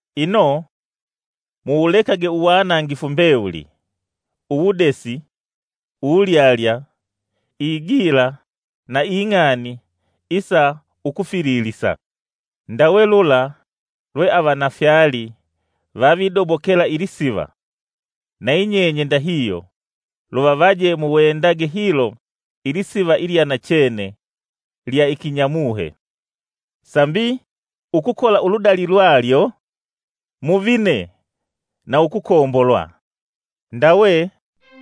Ino muwulekage uwanangifu mbewuli, uwudesi, uwulyalya, igila na ing'ani isa ukufililisa. Ndawe lula lwe avana fyali vavidobokela ilisiva, nayinyenye ndahihyo luvavaje muwendage hilo ilisiva ilyanachene lya ikinyamuhe, sambi ukukola uludali lwalyo muvine na ukukombolwa. Ndawe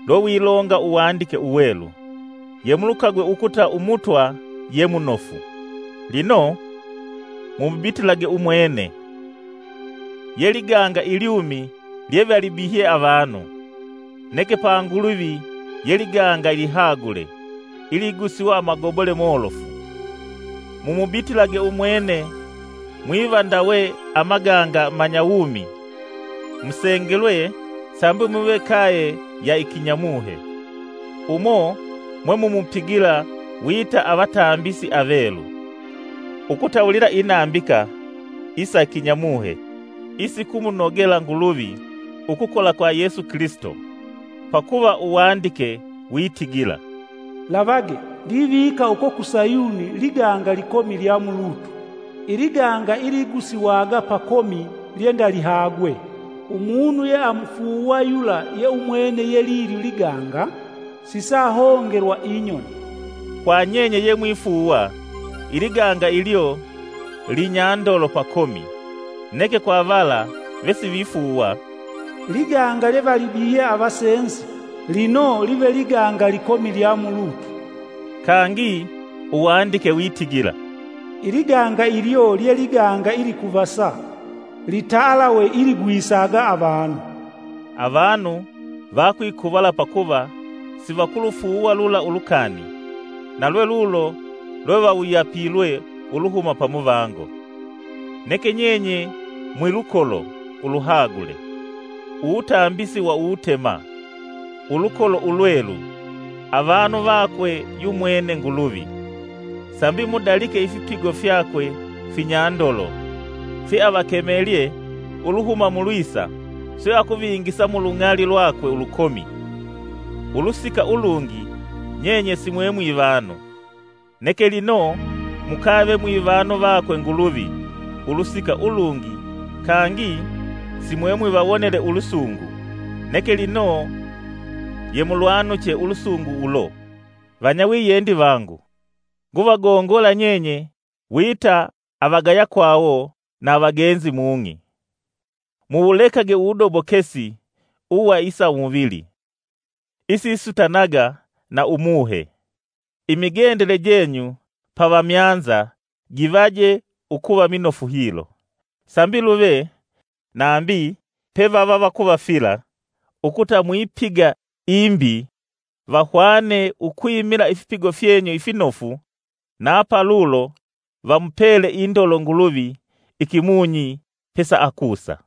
lwelwilonga Uwandike Uwelu, “Yemulukagwe ukuta Umutwa ye munofu.” Lino, mumubitilage Umwene, ye liganga ilyumi lyevalibihye avanu; neke pa Nguluvi ye liganga ilihagule, iligusiwa amagobole molofu. Mumubitilage umwene mwiva ndawe amaganga amanyawumi musengelwe sambi muve kaye ya ikinyamuhe, umo mwemumupigila wita avatambisi avelu, ukutawulila inambika isa kinyamuhe isikumunogela Nguluvi ukukola kwa Yesu Kilisito. Pakuva Uwandike witigila: “Lavage! Ndivika uko ku Sayuni liganga likomi lya mulutu, iliganga iligusiwaga pakomi lyendalihagwe. Umunu yeamufuuwa yula ye umwene yelilyo liganga, sisaahongelwa inyoni.” Kwa nyenye yemwifuuwa, iliganga ilyo linyandolo pakomi; neke kwa vala vesivifuuwa, “Liganga lyevalibihye avasenzi, lino live liganga likomi lya mulutu.” Kangi Uwandike witigila, “Ili ganga ilyo lye liganga ilikuvasa, litalawe iligwisaga avanu.” Avanu vakwikuvala pakuva siakulufuuwa lula ulukani; na lwelulo lwevawuyapilwe Uluhuma pamuvango. Neke nyenye mwilukolo uluhagule, uwutambisi wa uwutema, ulukolo ulwelu, avanu vakwe yumwene Nguluvi, sambi mudalike ifipigo fyakwe finyandolo fyeavakemelye uluhuma mulwisa swe akuvingisa mu lung'ali lwakwe ulukomi. Ulusika ulungi nyenye simwe mwivanu, neke lino mukave mwivanu vakwe Nguluvi ulusika ulungi kangi simwe mwivawonele ulusungu, neke lino yemulwanuche ulusungu ulo. Vanyawiyendi vangu nguvagongola nyenye wita avagayakwawo na avagenzi mung'i! Muwulekage uwudobokesi uwa isa umuvili isisutanaga na umuhe. Imigendele jenyu pa vamyanza givaje ukuva minofu hilo, sambi luve nambi pevavavakuvafila ukuta mwipiga imbi vahwane ukwimila ifipigo fyenyu ifinofu na palulo vamupele indolo Nguluvi ikimunyi pesaakusa.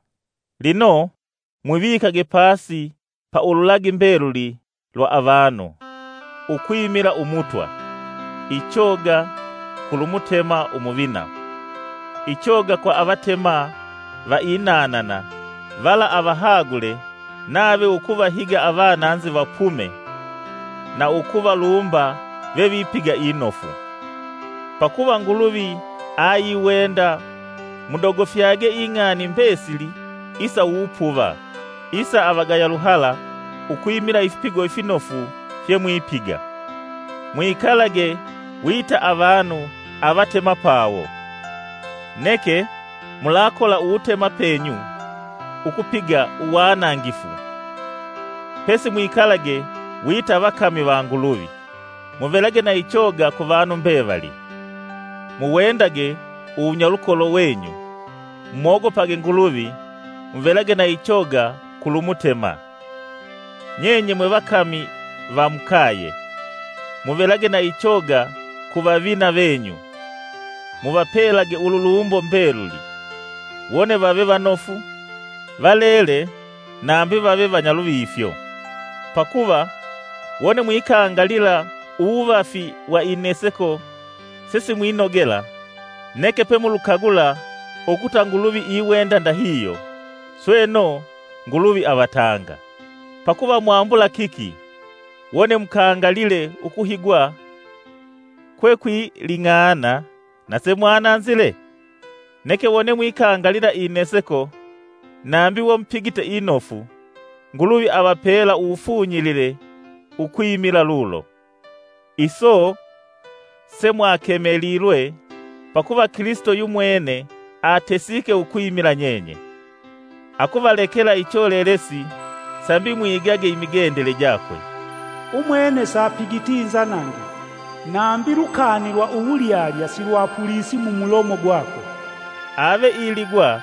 Lino, mwivikage pasi pa ululagi mbeluli lwa avanu, ukwimila Ummutwa; ichoga kulu Mutema umuvina, ichoga kwa avatema va inanana vala avahagule nave ukuvahiga avananzi vapume na ukuvalumba vevipiga inofu. Pakuva Nguluvi ayiwenda mudogofyage ing'ani mbesili isa uwupuva isa ava avagaya luhala ukwimila ifipigo ifinofu fyemwipiga. Mwikalage wita avanu avatemapawo; neke mulakola uwutemapenyu ukupiga uwanangifu, pesi mwikalage wita vakami va Nguluvi. Muvelage na ichoga ku vanu mbevali, muwendage uwunyalukolo venyu, mumogopage Nguluvi, muvelage na ichoga kulu Mutema. Nyenye mwevakami va mukaye, muvelage na ichoga ku vavina venyu muvapelage ululumbo mbeluli, wone vave vanofu, valele nambi vave vanyaluvifyo. Pakuva wone mwikangalila uwuvafi wa ineseko sesimwinogela neke pemulukagula ukuta Nguluvi iwenda ndahihyo, sweno Nguluvi avatanga. Pakuva mwambula kiki wone mukangalile ukuhigwa kwekwiling'ana na semwananzile? Neke wone mwikangalila ineseko nambi we mupigite inofu, Nguluvi avapela uwufunyilile ukwimila lulo. Iso semwakemelilwe; pakuva Kilisito yumwene atesike ukwimila nyenye, akuvalekela icholelesi, sambi mwigage imigendele jakwe. Umwene sapigiti inzanangifu, nambi lukani lwa uwulyalya silwapulisi mumulomo gwakwe. Ave iligwa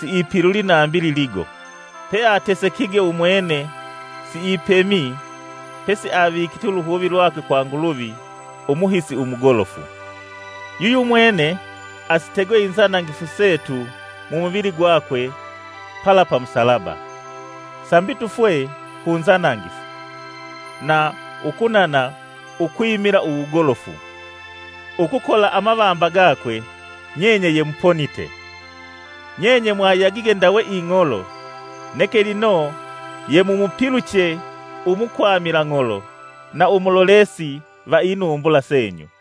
siipilulyi nambi liligo; peatesekige umwene siipemyi, pesi avikite uluhuvi lwakwe kwa Nguluvi, umuhisi umugolofu. Yuyumwene asitegwe inzanangifu setu mumuvili gwakwe pala pa Musalaba, sambi tufwe ku nzanangifu, na ukunana ukwimila uwugolofu. Ukukola amavamba gakwe, nyenye yemuponite. Nyenye mwayagige ndawe ing'olo, neke lino yemumupiluche, umukwamila ng'olo na umulolesi va inumbula senyu.